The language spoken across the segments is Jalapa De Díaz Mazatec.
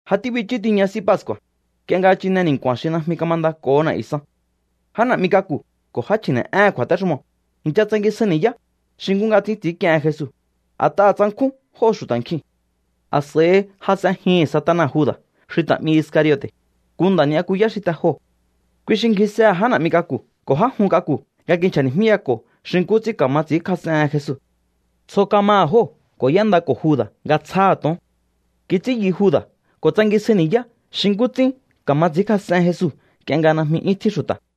Ja tíbichú tiña S'í Pascu̱a̱, nk'ie nga chine ni̱nku̱a̱n xi najmi kamandako̱ho na̱'yu̱ san. Já na̱'mi k'aku̱ ko̱ já chji̱ne̱'éhe̱n kju̱a̱téxumoo̱ i̱ncha tsangisjai ni̱yá xi nkú nga ts'ín ts'i̱ínk'iehen Jesu, a̱t'aha̱ tsankjún jóo̱ xu̱ta̱ nkjiu̱n. A̱s'a̱i jas'enjihi̱n Satana Juda̱ xi ta̱ 'mi Iscariote̱, nku nda̱ ni'yakuyá xi te joo̱. Kui xi ngjisehe̱ já na̱'mi k'aku̱ ko̱ já jun k'aku̱ nga kinchja̱ni̱jmíyako̱ xi nkú ts'ín ka̱ma ts'i̱ínkjas'ehen Jesu. Tsjo kamaha̱ jóo̱ ko̱ y'éndako̱ Juda̱ nga tsjáha̱ to̱on. Kits'ín yu Juda̱ ko̱ tsangisjai ni̱yá xi nkú ts'ín ka̱ma ts'i̱ínkjas'en Jesu nk'ie nga najmi 'yún tjín xu̱ta̱.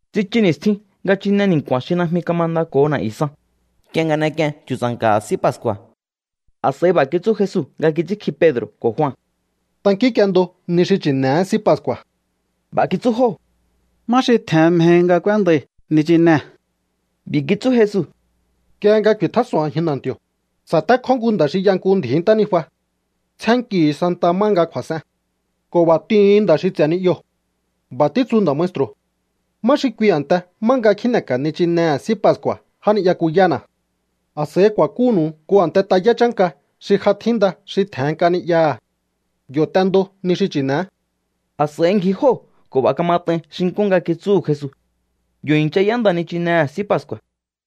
Tsichu ni̱stjin nga chine ni̱nku̱a̱n xi najmi kamandako̱ho na̱'yu̱ san, nk'ie nga n'ek'ien chu̱tsa̱nka̱ha̱ S'í Pascu̱a̱. A̱s'a̱i b'a̱ kitsú Jesu nga kits'ínkji Pedro̱ ko̱ Jua: —Tankínk'iendo ni xi chi̱ne̱é S'í Pascu̱a̱. B'a̱ kitsú jóo̱: —¿Má xi tje̱hen mjehi nga k'úéndai̱ nichinee̱? B'i̱ kitsú Jesu: —Nk'ie nga ku̱i̱tjás'o̱on a̱jin na̱nti̱o̱, sa̱tékjó nku nda̱ xi y'a nku ndji̱í ntánijua. Tsjénnkihu̱u santaha má nga kju̱a̱s'en ko̱ b'a̱ t'ihu̱un nda̱ xi ts'e̱ ni'yoo̱: “B'a̱ títsu nda̱ maestru̱: ¿Má xi kui a̱nte má nga kjíne̱ka̱ nichinehe̱ S'í Pascu̱a̱ já ni'yakuyána̱?” A̱s'a̱i ku̱a̱kúnu̱u nku a̱nte tayá chánka xi ja tjínda xi tje̱hen nk'a ni'yaha̱. Yo̱ t'endo ni xi chi̱ne̱é. A̱s'a̱i ngji jóo̱ ko̱ b'a̱ kamat'ain xi nkú nga kitsúhu̱ Jesu. Yo̱ i̱ncha y'énda nichinehe̱ S'í Pascu̱a̱.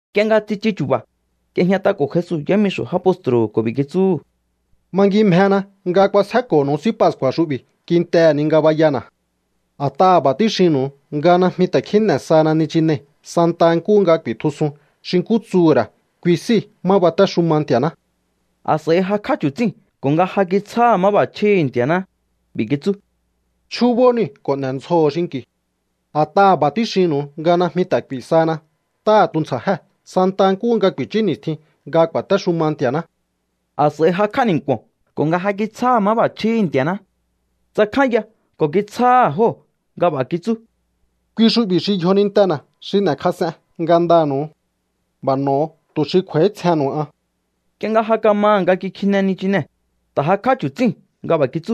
Nk'ie nga tsichu chu̱ba̱, y'ejñat'ako̱ Jesu yámixo̱ já postru̱hu̱ ko̱ b'i̱ kitsúhu̱: —Mangimjena nga kjuasjéko̱nu̱u S'í Pascu̱a̱ xu'bi̱ kintehe̱ ni ngabayana̱. A̱t'aha̱ b'a̱ tíxinnu̱u nga najmi ta̱ kjíne̱ sahana nichinei̱ santaha nkúhu nga ku̱i̱tjusun xi nkú tsuhu̱ ra̱ kui s'íi̱ má batéxuma Nti̱a̱ná. A̱s'a̱i jakj'á chu̱tsíu̱n ko̱ nga ja kitsjáha̱ máb'a̱chjíhi̱ Nti̱a̱ná, b'i̱ kitsú: —Chjúbó niu̱ ko̱ n'e̱ndzjoho̱o xinki̱u. A̱t'aha̱ b'a̱ tíxinnu̱u nga najmi ta̱ k'u̱i̱ sahana ntáha̱ tuntsja̱jée̱ santa nkúhu nga ku̱i̱chú ni̱stjin nga ku̱a̱téxuma Nti̱a̱ná. A̱s'a̱i jakj'á ni̱nku̱o̱n ko̱ nga ja kitsjáha̱ máb'a̱chjíhi̱ Nti̱a̱ná, tsakjánya ko̱ kitsjáha̱ jóo̱ nga b'a̱ kitsú: —Kui xu'bi̱ xi yjonintena̱ xi n'e̱kjas'en ngandanu̱u. B'a̱ n'o̱o tu̱ xi kj'u̱a̱ítsjennu̱u an. Nk'ie nga ja kamaha̱ nga kikjine nichinee̱, ta̱ jakj'á chu̱tsíu̱n nga b'a̱ kitsú: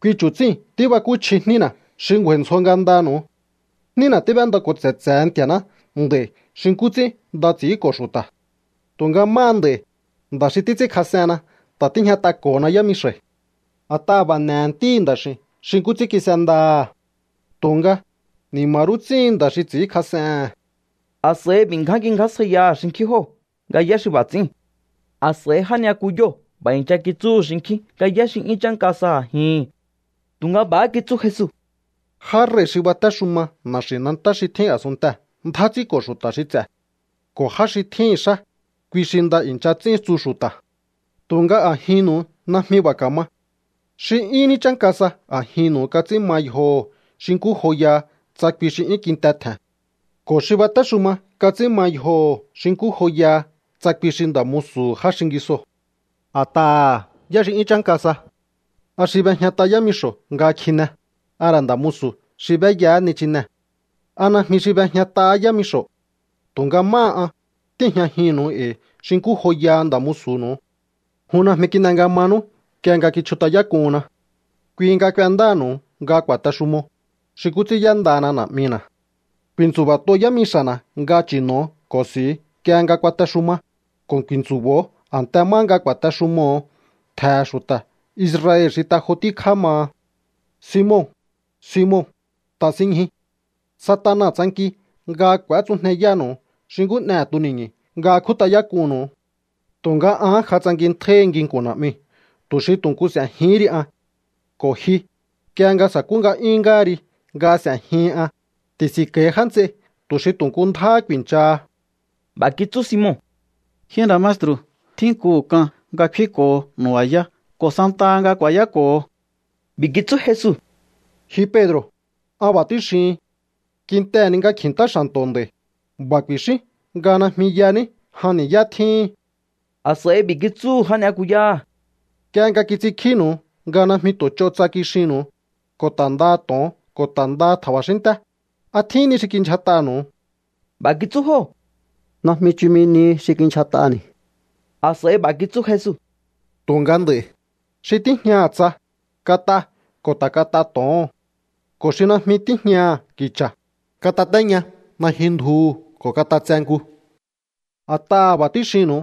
—Kui chu̱tsíi̱n tíbakúchji jnína̱ xi ngju̱a̱i̱ ndzjo ngandanu̱u. Jnína tíb'éndako̱ tse̱tse̱he Nti̱a̱ná nd'a̱i̱ xi nkú ts'ín nda ts'i̱ínko̱ xu̱ta̱. Tu̱nga máha nd'a̱i̱, nda̱ xi títs'ínkjas'enna ta̱ tíjñat'ako̱na yámixa̱i̱. A̱t'aha̱ b'a̱ n'e̱he̱ Ntíhi̱ Nda̱x'i̱u̱n xi nkú ts'ín kis'endaha̱. Tu̱nga, ¡ni̱ma̱ rú ts'íhin nda̱ xi ts'i̱ínkjas'ehe̱n! A̱s'a̱i b'i̱ ngján kingjásjaiyaha̱ xinkjín jóo̱ nga yá xi b'a̱ ts'i̱íu̱n. A̱s'a̱i já ni'yakuyóo̱ b'a̱ i̱ncha kitsúhu̱ xinkjín nga yá xi 'yún chánka sa a̱jihi̱n. Tu̱nga b'a̱há kitsú Jesu: —Já rei̱ xi batéxuma na̱xi̱nantá xi tjín a̱sunntee̱ ndjá ts'ínko̱ xu̱ta̱ xi ts'e̱. Ko̱ já xi tjíhi̱n xá, kui xi nda i̱ncha ts'ín, tsu xu̱ta̱. Tu̱nga a̱jinnu̱u najmi b'a̱ ka̱ma. Xi 'yún ní chánka sa a̱jinnu̱u kats'ín ma yjoho̱ xi nkú joyaha tsa kui xi 'yún kinte tje̱n. Ko̱ xi batéxuma kats'ín ma yjoho̱ xi nkú joyaha tsa kui xi nda̱ musu̱hu̱ já xingisoo̱. A̱t'aha̱, ¿yá xi 'yún chánka sa? ¿A xi b'ejñat'a yámixo̱ nga kjine, a ra̱ nda̱ musu̱ xi b'éyahá nichinee̱? ¿A najmi xi b'ejñat'ahá yámixo̱? Tu̱nga máha an, tíi̱jñajinnu̱u e̱i̱ xi nkú joyaha nda̱ musu̱nu̱u. ’Jun najmi kin'e nga manú nk'ie nga kichjut'ayák'unna. Kui nga k'uendáha̱nu̱u nga ku̱a̱texumo, xi nkú ts'ín y'éndana Na̱'mina̱. Ku̱i̱ntsu̱ba̱t'o yámixa̱na̱ nga chi̱no̱o ko̱ s'i̱u nk'ie nga kuatexuma, ko̱ ku̱i̱ntsu̱bo̱o a̱nte má nga ku̱a̱texumoho̱o ntje̱he̱ xu̱ta̱ Israel xi te jo tíkjá maha. ’Simon, Simon, ta̱sinñjui. Satana tsanki nga k'u̱étsujneyánu̱u xi nkú n'ehe̱ tuni̱ñu̱ nga kjút'ayák'unnu̱u. Tu̱nga an ja tsankintjáíhi nginku̱n Na̱'miu̱ tu̱ xi tu̱ nku s'e̱jihín ri an. Ko̱ ji, nk'ie nga sa̱kú nga'yún ngáha ri nga s'e̱jihin an, ti̱si̱nko̱i̱ já nts'ei tu̱ xi tu̱ nku ndjáhá ku̱i̱nchaha. B'a̱ kitsú Simon: —Ji nda̱ maestru̱, tjínkuhu̱ k'an nga kfínko̱ho nu̱ba̱yá ko̱ santaha nga ku̱a̱yáko̱ho. B'i̱ kitsú Jesu: —Ji Pedro̱, an b'a̱ tíxihin. Kintehe̱ ni nga kji̱ntá xa̱nto̱ nd'a̱i̱, b'a̱ ku̱i̱xín nga najmi yaní jan ni̱yá tjíhin. A̱s'a̱i b'i̱ kitsúhu̱ já ni'yakuyáha̱: —Nk'ie nga kits'inkjínu̱u nga najmi tu̱ ch'o tsa kixinnu̱u, ko̱ ta̱ ndaha to̱on ko̱ ta̱ ndaha tja̱ba̱xínnté, ¿a tjín ni xi kindyjat'anu̱u? B'a̱ kitsú jóo̱: —Najmi chumi nihi xi kindyjat'ani̱. A̱s'a̱i b'a̱ kitsú Jesu: —Tu̱nga nd'a̱i̱, xi tíjñaha̱ tsa, kat'a ko̱ ta̱ kat'a to̱oho̱n. Ko̱ xi najmi tíjñaha̱ ki̱cha̱, katatéña najyun ndjuhu̱ ko̱ kat'atse nku. A̱t'aha̱ b'a̱ tíxinnu̱u.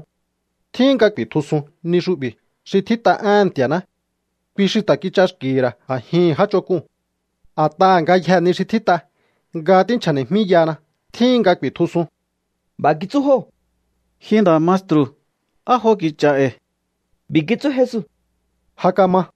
Tjíhin nga ku̱i̱tjusuhun ni xu'bi̱ xi tjít'a éhe̱n Nti̱a̱ná: “Kui xi ta̱ kich'axki̱hi̱ ra̱ a̱jihi̱n já ch'onk'uu̱n.” A̱t'aha̱ ngayjee̱ ni xi tjít'a nga tínchja̱ni̱jmíyahana tjíhin nga ku̱i̱tjusun. B'a̱ kitsú jóo̱: —Ji nda̱ maestru̱, ¡á jo ki̱cha̱ e̱i̱! B'i̱ kitsú Jesu: —Ja kama.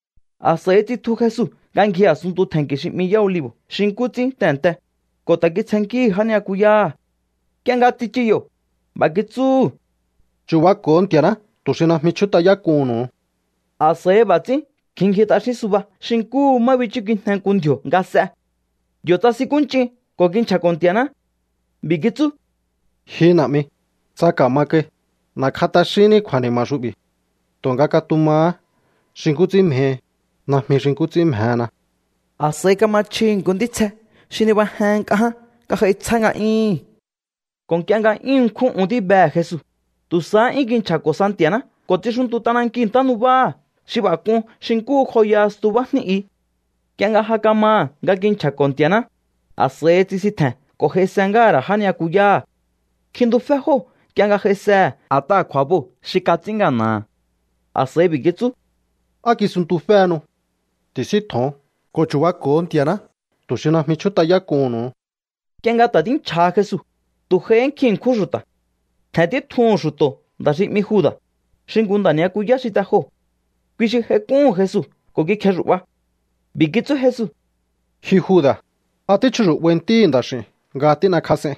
A̱s'a̱i tsitju Jesu nga ngji a̱sunntu tje̱nki̱ xi 'mi Yá Olivo̱ xi nkú ts'ín tehe̱nte, ko̱ ta̱ kitsjennkíhi̱ já ni'yakuyáha̱. Nk'ie nga tsichu yo̱, b'a̱ kitsúhu̱: —Chu̱bako̱o Nti̱a̱ná tu̱ xi najmi chjút'ayák'uhu̱nnu̱u. A̱s'a̱i b'a̱ ts'ín kjin ngji t'axín suba xi nkúhu má bichúkijne nku ndji̱o̱ nga s'e. Yo̱ tsasinkúnch'in ko̱ kinchja̱ko̱ Nti̱a̱ná. B'i̱ kitsú: —Ji Na̱'mi, tsa ka̱ma kai, n'e̱kj'a t'axínní kju̱a̱ni̱ma̱ xu'bi̱. Tu̱nga katumahá xi nkú ts'ín mjehi, najmi xi nkú ts'ín mjena. A̱s'a̱i kama chjihi̱ nku ntítsje xi nibajehen nk'a ján nga j'ai tsjá nga'yúhu̱n. Ko̱ nk'ie nga 'yún ṉkjún un tíbehe̱ Jesu, tu̱ sahá 'yún kinchja̱ko̱ sa Nti̱a̱ná ko̱ tsixuntu t'anankiu̱ ntánubáha̱ xi b'a̱ k'un xi nkú joyaha stubá jní i. Nk'ie nga ja kamaha̱ nga kinchja̱ko̱ Nti̱a̱ná, a̱s'a̱i tsisintje̱n ko̱ j'aise ngáha̱ ra̱ já ni'yakuyáha̱. Kjintufé jóo̱ nk'ie nga j'aisehe̱ a̱t'aha̱ kju̱a̱boo̱ xi kats'ín ngana̱ha̱. A̱s'a̱i b'i̱ kitsú: —¿Á kisunntuféhenu? Ti̱síntjo̱on ko̱ chu̱bako̱o Nti̱a̱ná tu̱ xi najmi chjút'ayák'uhu̱nnu̱u. Nk'ie nga ta̱ tínchja̱ha Jesu, tu̱ j'aihí nkjin ṉkjún xu̱ta̱. Tje̱n títjuhu̱n xu̱to̱ nda̱ xi 'mi Juda̱, xi nku nda̱ ni'yakuyá xi te joo̱. Kui xi j'aik'úhu̱n Jesu ko̱ kikjexu̱'ba. B'i̱ kitsú Jesu: —Ji Juda̱, ¿a tíchjuxu̱'bai Ntíhi̱ Nda̱x'i̱u̱n nga tín'ekjas'ein?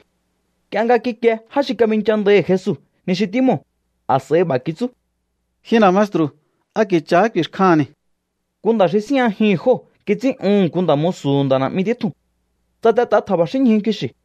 Nk'ie nga kikie já xi kabinchandaihi̱ Jesu ni xi tímoo̱, a̱s'a̱i b'a̱ kitsú: —Ji nda̱ maestru̱, ¿a ki̱cha̱ ku̱i̱xkjaha̱nni̱? Nku nda̱ xi síjñajihi̱n jóo̱ kits'ín'uhu̱n nku nda̱ musu̱hu̱ nda̱ na̱'mi títjuu̱n. Tsatet'a tja̱ba̱xínñju kixi̱.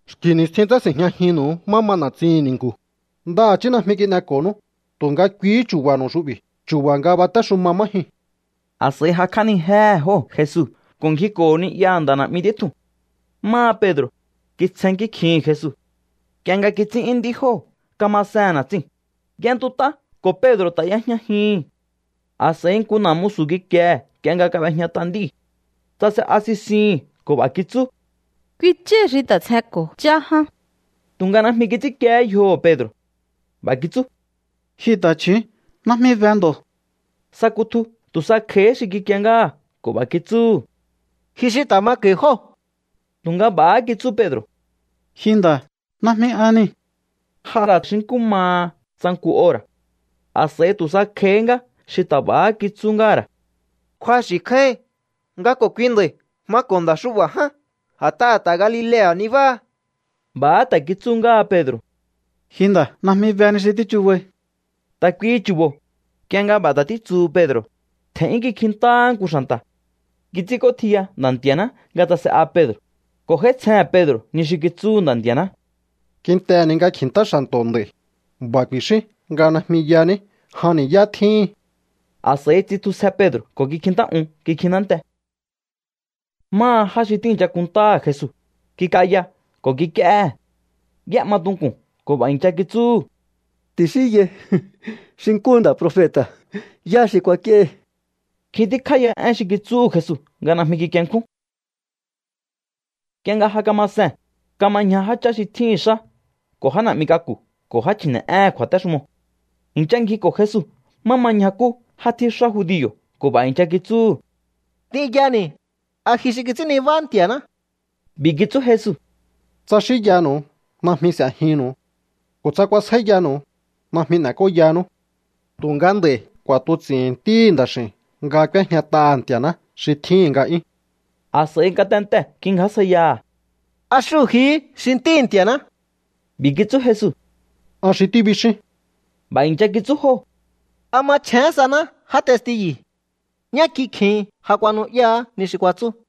Xki̱ ni̱stjin tsási̱njñajinnu̱u má ma na̱tsihi̱n ni̱nku̱. Ndaha̱chí najmi kin'eko̱nú. Tu̱nga kuihí chu̱ba̱nu̱u xu'bi̱, chu̱ba̱ nga batéxuma má jyuu̱n. A̱s'a̱i jakj'ánijéhe̱ jóo̱ Jesu ko̱ ngjiko̱ho̱ ni'yaha̱ nda̱ na̱'mi títjuu̱n. Máha Pedro̱, kitsjennkí kjihi̱n Jesu. Nk'ie nga kíts'ín'yún nd'í jóo̱ kamasehe̱n na̱tsiu̱n, y'entut'á ko̱ Pedro̱ ta̱ y'ejñajihi̱n. A̱s'a̱i nku na̱ musu̱ kikiehe̱ nk'ie nga kab'ejñat'a nd'íu̱. Tsase'a sisihi̱n ko̱ b'a̱ kitsú: —Kui chái̱ xi ta̱ tsjenko̱ chá ján. Tu̱nga najmi kits'ínkiehé yjoho̱ Pedro̱. B'a̱ kitsú: —Ji ta̱chju̱ún, najmi be ndo̱. Sa kutju tu̱ sa kj'a̱íhí xi kikie ngáha̱ ko̱ b'a̱ kitsúhu̱: —Ji xi ta̱ mako̱i̱ jóo̱. Tu̱nga b'a̱há kitsú Pedro̱: —Ji nda̱, najmi an niu̱. J'a ra̱ xi nkú maha tsa nku ora̱. A̱s'a̱i tu̱ sa kj'a̱í ngá xi ta̱ b'a̱há kitsú ngáha̱ ra̱: —Kju̱axi̱ kjáíhin nga ko̱ kui nda̱i̱ mako̱ nda̱ xu'ba̱ ján, a̱t'aha̱ ta̱ Galilea̱ nabáha. B'a̱há ta̱ kitsú ngáha Pedro̱: —Ji nda̱, najmi be ni xi tíchubai. Ta̱ kuihi chu̱bo̱, nk'ie nga b'a̱ ta̱ títsuhu Pedro̱, tje̱n'yún kikjintáhá nku xa̱nta̱. Kits'ínk'ótjiya Nda̱ Nti̱a̱ná nga tsase'a Pedro̱, ko̱ j'áítsjehe̱n Pedro̱ ni xi kitsúhu̱ Nda̱ Nti̱a̱ná: “Kintehe̱ ni nga kji̱ntá xa̱nto̱ nd'a̱i̱, b'a̱ ku̱i̱xín nga najmi yaní jan ni̱yá tjíhin.” A̱s'a̱i tsitjusje Pedro̱ ko̱ kikjintá'un kikjintánte. Máha já xi tíi̱ncha kunntáha̱ Jesu, kik'aya ko̱ kik'íéhe̱. Y'é'ma tunku̱n ko̱ b'a̱ i̱ncha kitsúhu̱: —Ti̱xínyai xi nkúhu nda̱ profeta̱, ¿yá xi kuak'íéhi? Nkjin tíkjá ya én xi kitsúhu̱ Jesu nga najmi kikienkjún. Nk'ie nga ja kama see̱n, kama ñja jáchá xi tjíhi̱n xá ko̱ já na̱'mi k'aku̱ ko̱ já chji̱ne̱'éhe̱n kju̱a̱téxumoo̱. I̱ncha ngjiko̱ Jesu má ma ñjakú já tjíxá judio̱ ko̱ b'a̱ i̱ncha kitsúhu̱: —T'inyani̱, ¿a ji xi kits'ín nibá Nti̱a̱ná? B'i̱ kitsú Jesu: —Tsa xínyanu̱u, najmi s'e̱jinnu̱u. Ko̱ tsa kuasjáíyanu̱u, najmi n'e̱k'óyanú. Tu̱nga nd'a̱i̱ k'u̱a̱tuts'i̱hi̱n Ntíhi̱ Nda̱x'i̱u̱n nga k'úéjñat'aha̱ Nti̱a̱ná xi tjíhi̱n nga'yún. A̱s'a̱i ngatentee̱ kingjásjaiyaha̱: —¿A xúhu̱ jihí xi Ntíhi̱ Nti̱a̱ná? B'i̱ kitsú Jesu: —An xi tíbixíún. B'a̱ i̱ncha kitsú jóo̱: —¿A machjén saná já testiyu̱? Ñá kikjin ja kuanu'yáá ni xi kuatsú.